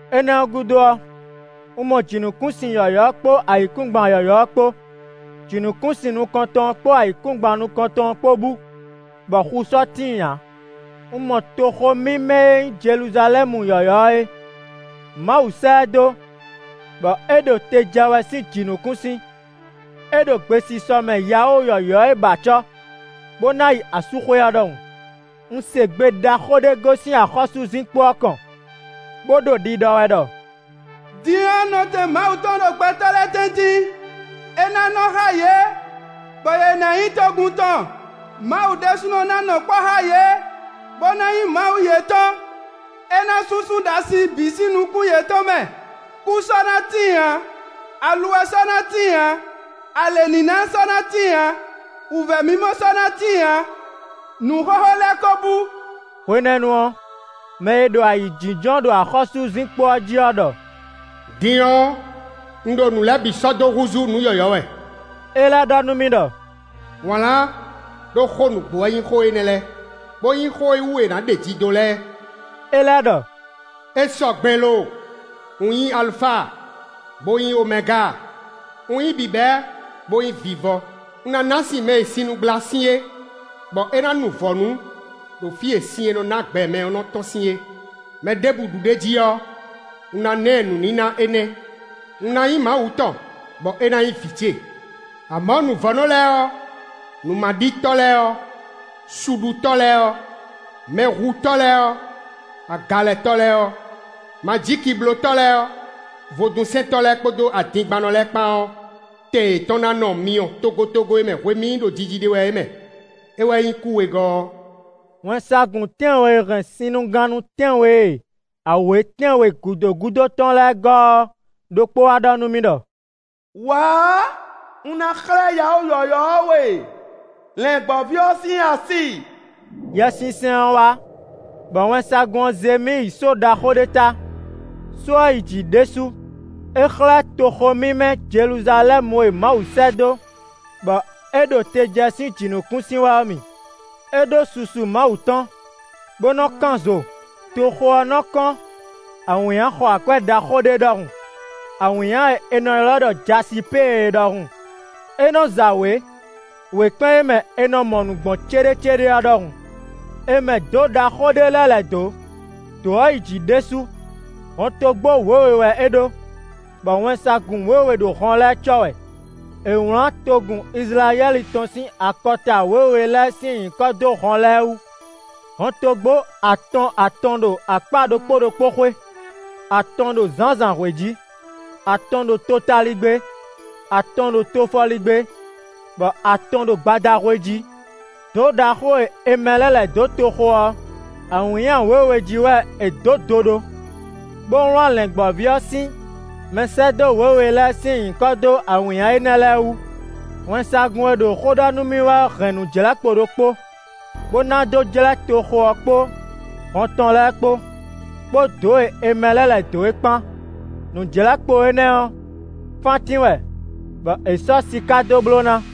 Énɛ́ ɔ́ gúdo ɔ́, un mɔ jǐnukúnsin yɔ̌yɔ́ ɔ́ kpó ayǐkúngban yɔ̌yɔ́ ɔ́ kpó. Jǐnukúnsin nukɔntɔn ɔ́ kpó ayǐkúngban nukɔntɔn ɔ́ kpó bú, bɔ xu sɔ́ tíin ǎ. Un mɔ toxo mímɛ́ e nyí Jeluzalɛ́mu yɔ̌yɔ́ ɔ́ é; Mawu sɛ́ ɛ dó, bɔ é ɖo te jɛ wɛ sín jǐnukúnsin. É ɖo gbesisɔ mɛ yawó yɔ̌yɔ́ e ba acɔ́, bó ná yi asúxwé ɔ́ ɖɔhun. Un se gbe ɖaxó ɖé gosín axɔ́súzinkpo ɔ́ kɔn, bó ɖo ɖiɖɔ wɛ ɖɔ: “Din ɔ́, nɔtɛn Mawu tɔn ɖo gbɛtɔ́ lɛ́ɛ tɛ́ntin! É ná nɔ xá yě, bɔ yě ná nyí togun tɔn. Mawu ɖésúnɔ ná nɔ kpɔ́ xá yě, bó ná nyí Mawu yětɔn. È nǎ súnsún ɖasin bǐ sín nukún yětɔn mɛ; kú sɔ́ ná tíin ǎ, aluwɛ sɔ́ ná tíin ǎ, alěníná sɔ́ ná tíin ǎ, wǔvɛ́ mimɔ sɔ́ ná tíin ǎ; nǔ xóxó lɛ́ɛ ko bú.” Hwenɛ́nu ɔ́, mɛ e ɖo ayǐjínjɔ́n ɖo axɔ́súzinkpo ɔ́ jí ɔ́ ɖɔ: “Din ɔ́, un ɖo nǔ lɛ́ɛ bǐ sɔ́ dó húzú nǔ yɔ̌yɔ́ wɛ.” É lɛ́ ɖɔ nú mì ɖɔ: “Wlǎn, ɖó xó nǔgbó wɛ nyí xó énɛ́ lɛ́ɛ, bó nyí xó e wú è nǎ ɖeji dó lɛ́ɛ.” É lɛ́ ɖɔ: “É sɔgbe lo! Un nyí Alufa, bó nyí Omɛga; un nyí bǐbɛ́, bó nyí vivɔ. Un ná ná sin mɛ e sinnugblá sin é, bɔ é ná nu vɔ̌nu ɖo fí e sin e nɔ ná gbɛ mɛ ɔ́ nɔ tɔ́n sín é. Mɛɖěbǔ ɖu ɖ'é jí ɔ́, un ná ná ɛ nǔníná énɛ́; un ná nyí Mawu tɔn, bɔ é ná nyí vǐ ce. Amɔ̌ nǔvɔ́nɔ lɛ́ɛ ɔ́, nǔmaɖitɔ́ lɛ́ɛ ɔ́, suɖutɔ́ lɛ́ɛ ɔ́, mɛhutɔ́ lɛ́ɛ ɔ́, agalɛtɔ́ lɛ́ɛ ɔ́, majíkiblótɔ́ lɛ́ɛ ɔ́, vodúnsɛntɔ́ lɛ́ɛ kpódó adingbannɔ lɛ́ɛ bǐ kpán ɔ́, tɛn yětɔn ná nɔ myɔ togotogo e mɛ hwemí ɖo jiji ɖe wɛ é mɛ; é wɛ nyí kú wegɔ́ ɔ́.” Wɛnsagun tɛ́nwe e hɛn sinnugannú tɛ́nwe e awě tɛ́nwe gǔdo gúdo tɔn lɛ́ɛ gɔ́ ɔ́ ɖokpó wá ɖɔ nú mì ɖɔ: “Wǎ! Un ná xlɛ́ yawó yɔ̌yɔ́ ɔ́ we, Lɛ̌ngbɔ́ví ɔ́ sín asi.” Yɛsinsɛn ɔ́ wá bɔ wɛnsagun ɔ́ zé mì yi só ɖaxó ɖé ta; só ɔ́ yi jǐ ɖésú. É xlɛ́ toxo mímɛ́ Jeluzalɛ́mu e Mawu sɛ́ dó, bɔ é ɖo te jɛ sín jǐnukúnsin wɛ ɔ́ mì. É ɖó susu Mawu tɔn, bó nɔ́ kán zo. Toxo ɔ́ nɔ kɔ́n awǐnnya xɔ akwɛ́ ɖaxó ɖé ɖɔhun; awǐnnya e è nɔ ylɔ́ ɖɔ jasipée é ɖɔhun; é nɔ za wě wěkpɛ́n e mɛ è nɔ mɔ nǔ gbɔn céɖécéɖé ɔ́ ɖɔhun. È mɛ dǒ ɖaxó ɖé lɛ́ lɛ̌ dó, dǒ ɔ́ yi jǐ ɖésú. Hɔntogbó wěwe wɛ é ɖó, bɔ wɛnsagun wěwe ɖo hɔn lɛ́ɛ cɔ́ wɛ. È wlǎn togun Izlayɛ́li tɔn sín akɔta wěwe lɛ́ɛ sín nyǐkɔ dó hɔn lɛ́ɛ wú. Hɔntogbó atɔn atɔn ɖo akpá ɖokpó ɖokpó xwé: atɔn ɖo zǎnzǎnhwe jí, atɔn ɖo totaligbé, atɔn ɖo tofɔligbé, bɔ atɔn ɖo gbadahwe jí. Dǒ ɖaxó e è mɛ lɛ́ lɛ̌ dó toxo ɔ́, awǐnnya wěwe jí wɛ è dǒ do ɖó, bó wlǎn Lɛ̌ngbɔ́ví ɔ́ sín mɛsɛ́dó wěwe lɛ́ɛ sín nyǐkɔ dó awǐnnya énɛ́ lɛ́ɛ wú. Wɛnsagun e ɖo xó ɖɔ nú mì wɛ ɔ́ hɛn nǔjlɛ́kpo ɖokpó, bó ná dó jlɛ́ toxo ɔ́ kpó hɔn tɔn lɛ́ɛ kpó, kpó dǒ e è mɛ lɛ́ lɛ̌ dó é kpán. Nǔjlɛ́kpo énɛ́ ɔ́, fántín wɛ, bɔ è sɔ́ siká dó bló ná.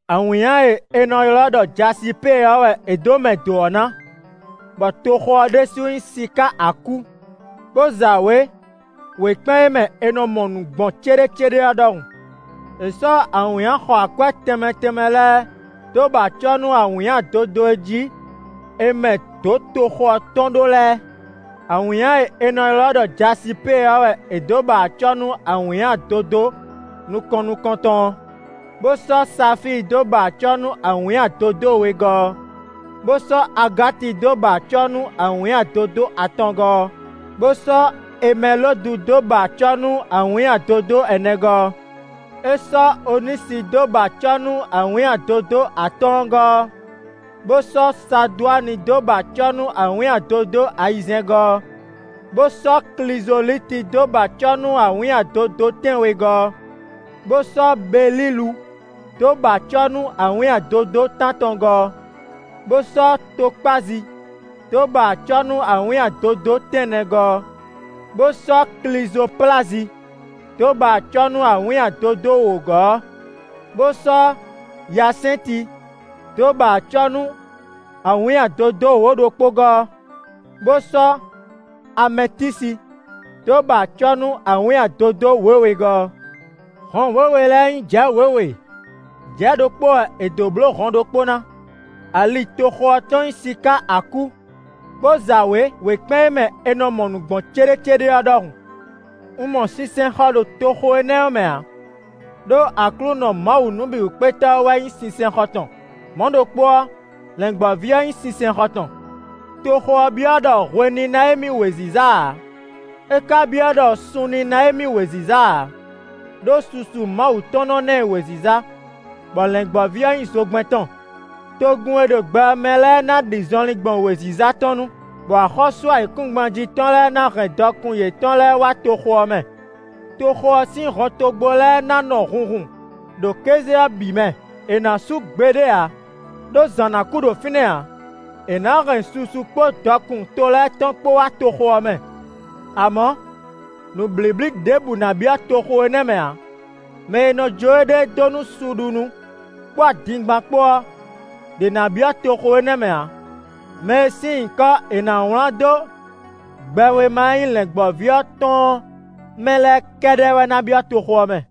Awǐnnya e è nɔ ylɔ́ ɖɔ jasipée ɔ́ wɛ è dó mɛ dǒ ɔ́ ná, bɔ toxo ɔ́ ɖésú nyí siká akú, bó za wě wěkpɛ́n e mɛ è nɔ mɔ nǔ gbɔn céɖécéɖé ɔ́ ɖɔhun. È sɔ́ awǐnnya xɔ akwɛ́ tɛnmɛ tɛnmɛ lɛ́ɛ dó ba acɔ́ nú awǐnnya dodó e jí è mɛ dǒ toxo ɔ́ tɔn ɖó lɛ́ɛ: awǐnnya e è nɔ ylɔ́ ɖɔ jasipée ɔ́ wɛ è dǒ ba acɔ́ nú awǐnnya dodó nukɔn nukɔntɔn ɔ́, bó sɔ́ safíi dó ba acɔ́ nú awǐnnya dodó wegɔ́ ɔ́, bó sɔ́ agáti dó ba acɔ́ nú awǐnnya dodó atɔngɔ́ ɔ́, bó sɔ́ emɛlodu dó ba acɔ́ nú awǐnnya dodó ɛnɛgɔ́ ɔ́. É sɔ́ onísi dó ba acɔ́ nú awǐnnya dodó atɔ́ɔ́ngɔ́ ɔ́, bó sɔ́ sadwáni dó ba acɔ́ nú awǐnnya dodó ayizɛ́ngɔ́ ɔ́, bó sɔ́ klizolíti dó ba acɔ́ nú awǐnnya dodó tɛ́nwegɔ́ ɔ́, bó sɔ́ belilu dó ba acɔ́ nú awǐnnya dodó tántɔngɔ́ ɔ́, bó sɔ́ tokpázi dó ba acɔ́ nú awǐnnya dodó tɛ́nnɛgɔ́ ɔ́, bó sɔ́ klizoplazi dó ba acɔ́ nú awǐnnya dodó wǒgɔ́ ɔ́, bó sɔ́ yasɛnti dó ba acɔ́ nú awǐnnya dodó wǒ-ɖokpógɔ́ ɔ́, bó sɔ́ amɛtisi dó ba acɔ́ nú awǐnnya dodó wěwegɔ́ ɔ́. Hɔn wěwe lɛ́ɛ nyí jɛ̌ wěwe; jɛ̌ ɖokpó wɛ è dǒ bló hɔn ɖokpó ná. Ali toxo ɔ́ tɔn nyí siká akú, bó za wě wěkpɛ́n e mɛ è nɔ mɔ nǔ gbɔn céɖécéɖé ɔ́ ɖɔhun. Un mɔ sinsɛnxɔ ɖo toxo énɛ́ ɔ́ mɛ ǎ, ɖó Aklúnɔ Mawu Nǔbǐwúkpétɔ́ ɔ́ wɛ nyí sinsɛnxɔ tɔn; mɔ̌ ɖokpó ɔ́, Lɛ̌ngbɔ́ví ɔ́ nyí sinsɛnxɔ tɔn. Toxo ɔ́ byɔ́ ɖɔ hwe ní ná émí wěziza ǎ; é ka byɔ́ ɖɔ sun ní ná émí wěziza ǎ, ɖó susu Mawu tɔn nɔ ná ɛ wěziza, bɔ Lɛ̌ngbɔ́ví ɔ́ nyí zogbɛ́n tɔn. Togun e ɖo gbɛ ɔ́ mɛ lɛ́ɛ ná ɖi zɔnlin gbɔn wěziza tɔn nú, bɔ axɔ́sú ayǐkúngban jí tɔn lɛ́ɛ ná hɛn dɔkun yětɔn lɛ́ɛ wá toxo ɔ́ mɛ. Toxo ɔ́ sín hɔntogbó lɛ́ɛ ná nɔ hunhun ɖo kéze ɔ́ bǐ mɛ; è nǎ sú gbeɖé ǎ, ɖó zǎn ná kú ɖo fínɛ́ ǎ. È nǎ hɛn susu kpó dɔkun to lɛ́ɛ tɔn kpó wá toxo ɔ́ mɛ. Amɔ̌ nǔblíblí ɖěbǔ ná byɔ́ toxo énɛ́ mɛ ǎ; mɛ e nɔ jó éɖée dó nú suɖunú kpó adingban kpó ɔ́, ɖě ná byɔ́ toxo énɛ́ mɛ ǎ. Mɛ e sín nyǐkɔ e è nǎ wlán dó gbɛwéma e nyí Lɛ̌ngbɔ́ví ɔ́ tɔn ɔ́ mɛ lɛ́ɛ kɛ́ɖɛ́ wɛ ná byɔ́ toxo ɔ́ mɛ.